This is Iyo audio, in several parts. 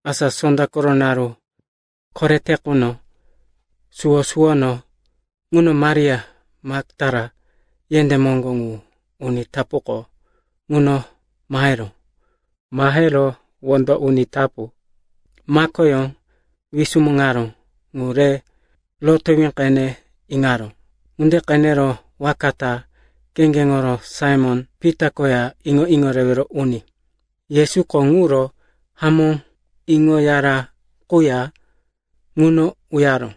Asa sonda koro naru korete quno, suwo-suwono ŋuno Maria Maktala yendé moŋgo ŋu uni tapuko ŋuno maheró. Mahero wondo uni tapu makoyó wisumuŋaró ŋu re rotowí qene iŋaró. Ŋunde qenero waka ta kheŋgeŋo Saimon-Pita koya iŋo-iŋo rewero uni Yesuko ŋuro hamó iŋoyara quya ŋuno uyaró.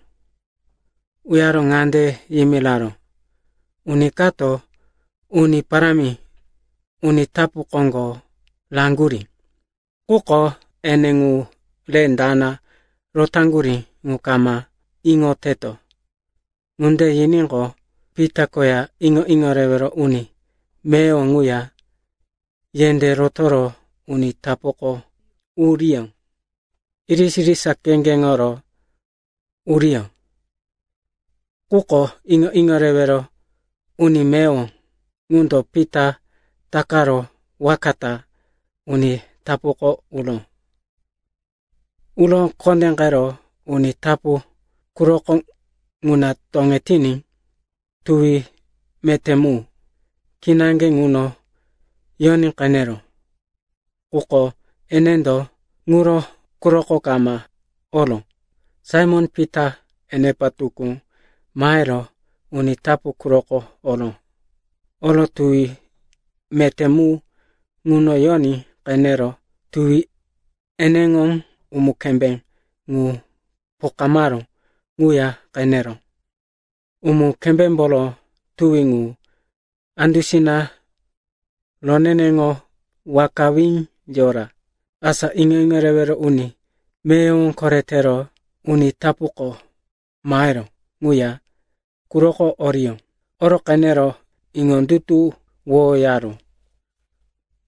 Uyaro ŋande yimiraró, “Uni kato Uni Parámi uni tapu koŋgo raŋgurí, quko ene ŋu re dana rotaŋgurí ŋu kama iŋoteto.” Ŋunde yiníqo, Pita koya iŋo-iŋo rewero uni meyowo ŋuya yendé rotoro uni tapuko uriyó. Irisa-irisa kheŋgeŋo uriyó, quko iŋo-iŋo rewero uni meyowo ŋundo Pita takaro waka ta uni tapuko uró. Uro kondéqero uni tapu quroko ŋuna toŋetiní tuwi meté mu kinaŋge ŋuno yoní qeneró. Quko enendo ŋuro quroko kama oró. Saimon-Pita enepa tukú mahero uni tapu quroko oró. Oro tuwi meté mu ŋuno yoní qenero tuwi eneŋo umu-kembé ŋu pokamaró ŋuya qeneró. Umu-kembémboro tuwi ŋu andusina roneneŋo wakawí yora. Asa iŋo-iŋo rewero uni meyowo koretero uni tapuko maheró ŋuya quroko oró. Oro qenero iŋondutuwoyaró.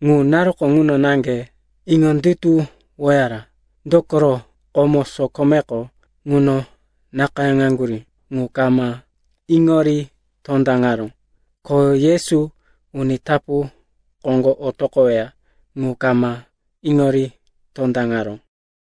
(Ŋu naruko ŋuno naŋge iŋondutuwoyaró, dokoro komo, sokomeko ŋuno nakayáŋaŋgurí ŋu kama iŋori tondaŋaró, ko Yesu uni tapu koŋgo otoqoweya ŋu kama iŋori tondaŋaró.)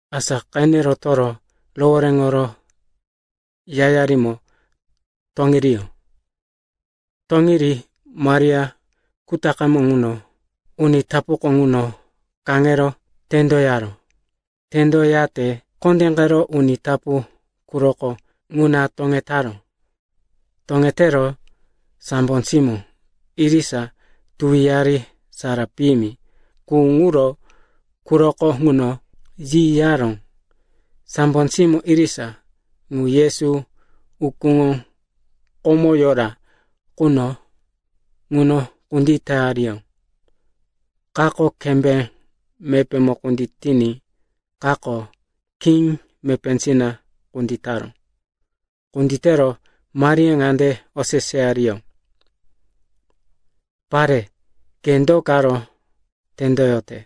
Asa qene rotoro rohoréŋoro yayarimo toŋiriyó. Toŋiri Maria kutaqemo uni tapuko ŋuno kaŋero tendoyaró. Tendo yate kondéqero uni tapu quroko ŋuna toŋetaró. Toŋetero sambo simó irisa tuwiyari sara piyimi qu ŋuro quroko ŋuno yiyaró. Sambo simó irisa ŋu Yesu ukúŋo komo yora quno ŋuno kunditeyariyó, kato kembé mepémo kunditiní, kato khí mepésina kunditaró. Kunditero Maria ŋande oseseyariyó, “Pare, ke do karo tendoyote?”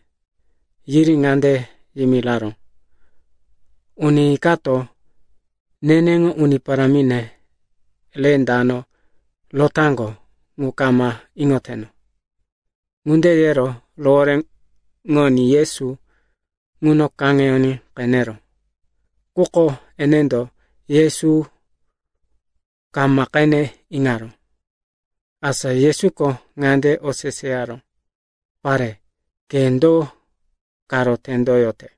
Yiri ŋande yimiraró, “Uni kato neneŋo Uni Parámine re dano rotaŋgo ŋu kama iŋoteno.” Ŋunde yero rohoréŋoní Yesu ŋuno kaŋeyoní qeneró. Quko enendo Yesu kama qene iŋaró. Asa Yesuko ŋande oseseyaró, “Pare, ke do karo tendoyote?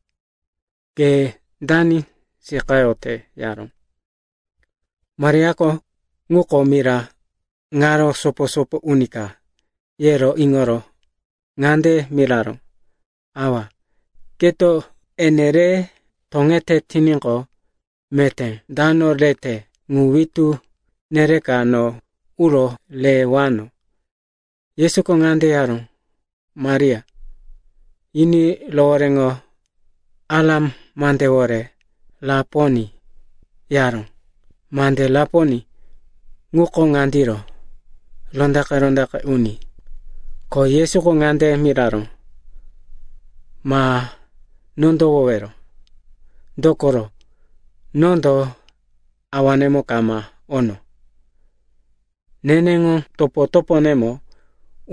Ke dani seqayote?” yaró. Mariako, ŋuko mira ŋaro sopo-sopo uni ka, yero iŋoro ŋande miraró, “Awa, keto ene re toŋete tiníqo, meté dano rete ŋu witú nereka no uro rewano.” Yesuko ŋande yaró, “Maria.” Yiní rohoréŋo Aram mandewore, “Raponi,” yaró. (Mande “Raponi” ŋuko ŋandiro, “Rondaqe-rondaqe Uni.”) Ko Yesuko ŋande miraró, “Ma nondowowero, dokoro nondo Awanemo kama ono. Neneŋo topo-toponemo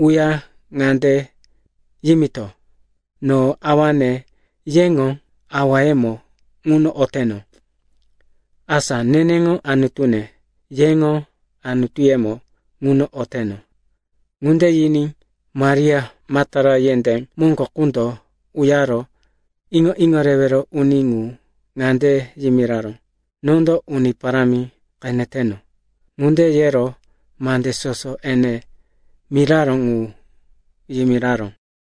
uya ŋande yimito, no Awane, yeŋo Awayemo ŋuno oteno, asa neneŋo Anutune, yeŋo Anutuyemo ŋuno oteno.” Ŋunde yiní Maria Maktala yendé moŋgo ŋundo uyaro iŋo-iŋo rewero uni ŋu ŋande yimiraró, “Nondo Uni Parámi qeneteno!” Ŋunde yero mande soso ene miraró ŋu yimiraró.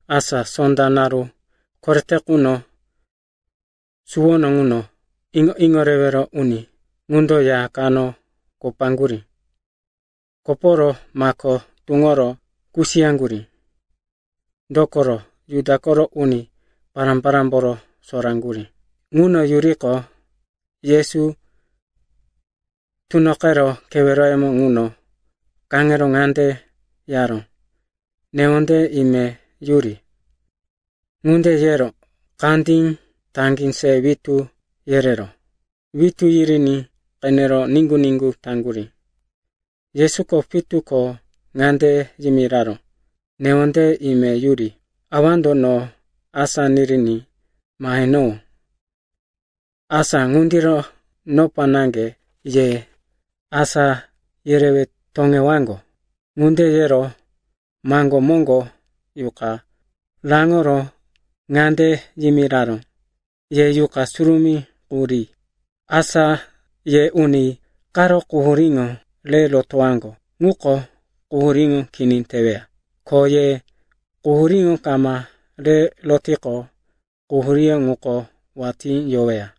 Asa sonda naru korete quno suwono ŋuno, iŋo-iŋo rewero uni ŋundo ya kano kopaŋgurí. Koporo mako tuŋoro kusiyaŋgurí, dokoro Juda koro uni pará-parámboro soraŋgurí. Ŋuno yuriqo, Yesu tunoqero keweroyemo ŋuno kaŋero ŋande yaró, “Newondeye ime yuri.” Ŋunde yero, kandí, taŋgí se witú yereró. Witú yiriní qenero niŋgu-niŋgu taŋgurí. Yesuko pitu ko ŋande yimiraró, “Newondeye ime yuri. Awando no asá niriní mahenowó. Asa ŋundiro nopa naŋge ye asá yerewe toŋewaŋgo.” Ŋunde yero maŋgó moŋgo yuqa raŋoro ŋande yimiraró, “Ye Yuqa Surumí qu ri. Asa ye uni karo quhuríŋo re rotowaŋgo quko quhuríŋo kini teweya. Ko ye quhuríŋo kama re rotiqo, quhuríŋo ŋuko watí yoweya.”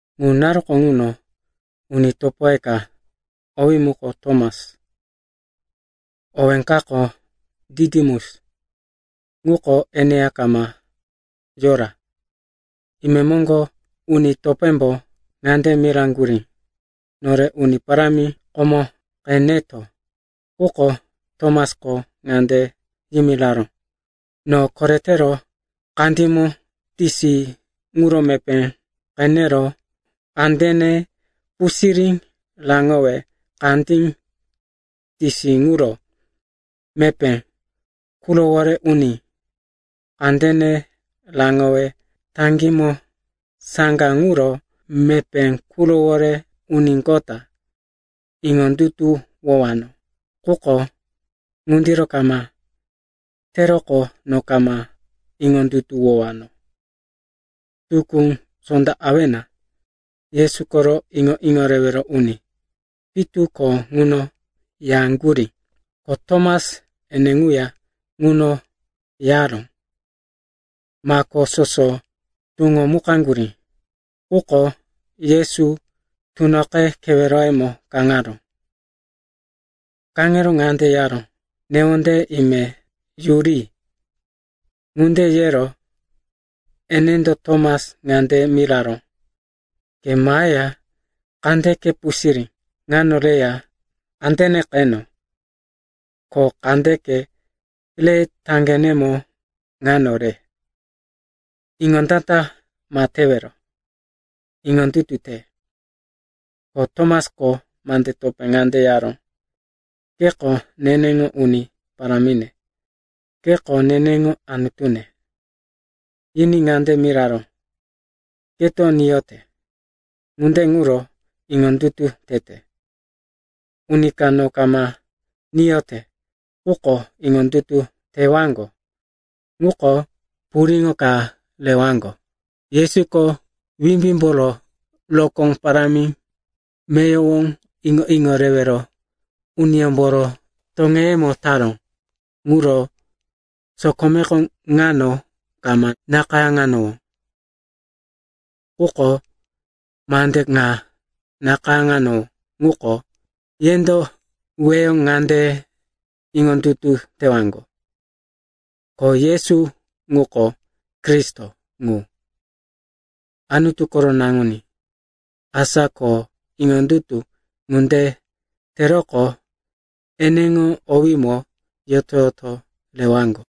Ŋu naruko ŋuno uni topoye ka, owí muko Tomas (owí kako Ditimus), ŋuko eneya kama yora. Imemoŋgo uni topémbo ŋande miraŋgurí, “Nore Uni Parámi komo qeneto.” Quko Tomasko ŋande yimiraró, “No koretero kandímo tisi ŋuro mepé qenero, kandene pusirí raŋowe kandí tisi ŋuro mepé qurowore uní, kandene raŋowe taŋgímo saŋga ŋuro mepé qurowore uníqota, iŋondutuwowano. Quko ŋundiro kama teroqo no kama iŋondutuwowano.” Tukú, sonda awena, Yesu koro iŋo-iŋo rewero uni pitu ko ŋuno yaŋgurí, ko Tomas ene ŋuya ŋuno yaró. Mako soso tuŋomukaŋgurí, quko Yesu tunoqe keweroyemo kaŋaró. Kaŋero ŋande yaró, “Newondeye ime yuri.” Ŋunde yero enendo Tomas ŋande miraró, “Ke maheya kandeke pusirí ŋano reya kandene qeno. Ko kandeke re taŋgenemo ŋano re. Iŋondata ma tewero, iŋondutu te.” Ko Tomasko mande topé ŋande yaró, “Keko neneŋo Uni Parámine, keko neneŋo Anutune.” Yiní ŋande miraró, “Keto niyote, ŋunde ŋuro iŋondutu tete. Uni ka no kama niyote quko iŋondutu tewaŋgo ŋuko puriŋo ka rewaŋgo.” Yesuko wimbímboro rokó parámi meyowo iŋo-iŋo rewero uniyómboro toŋeyemo taró ŋuro sokomeko ŋano kama nakayáŋanowó. Quko mande ŋa nakayáŋanowó ŋuko, yendo weyo ŋande iŋondutu tewaŋgo, ko Yesu ŋuko Kristo ŋu, Anutu koro Naŋuní. Asa ko iŋondutu ŋunde teroqo eneŋo owímo yoto-yoto rewaŋgo.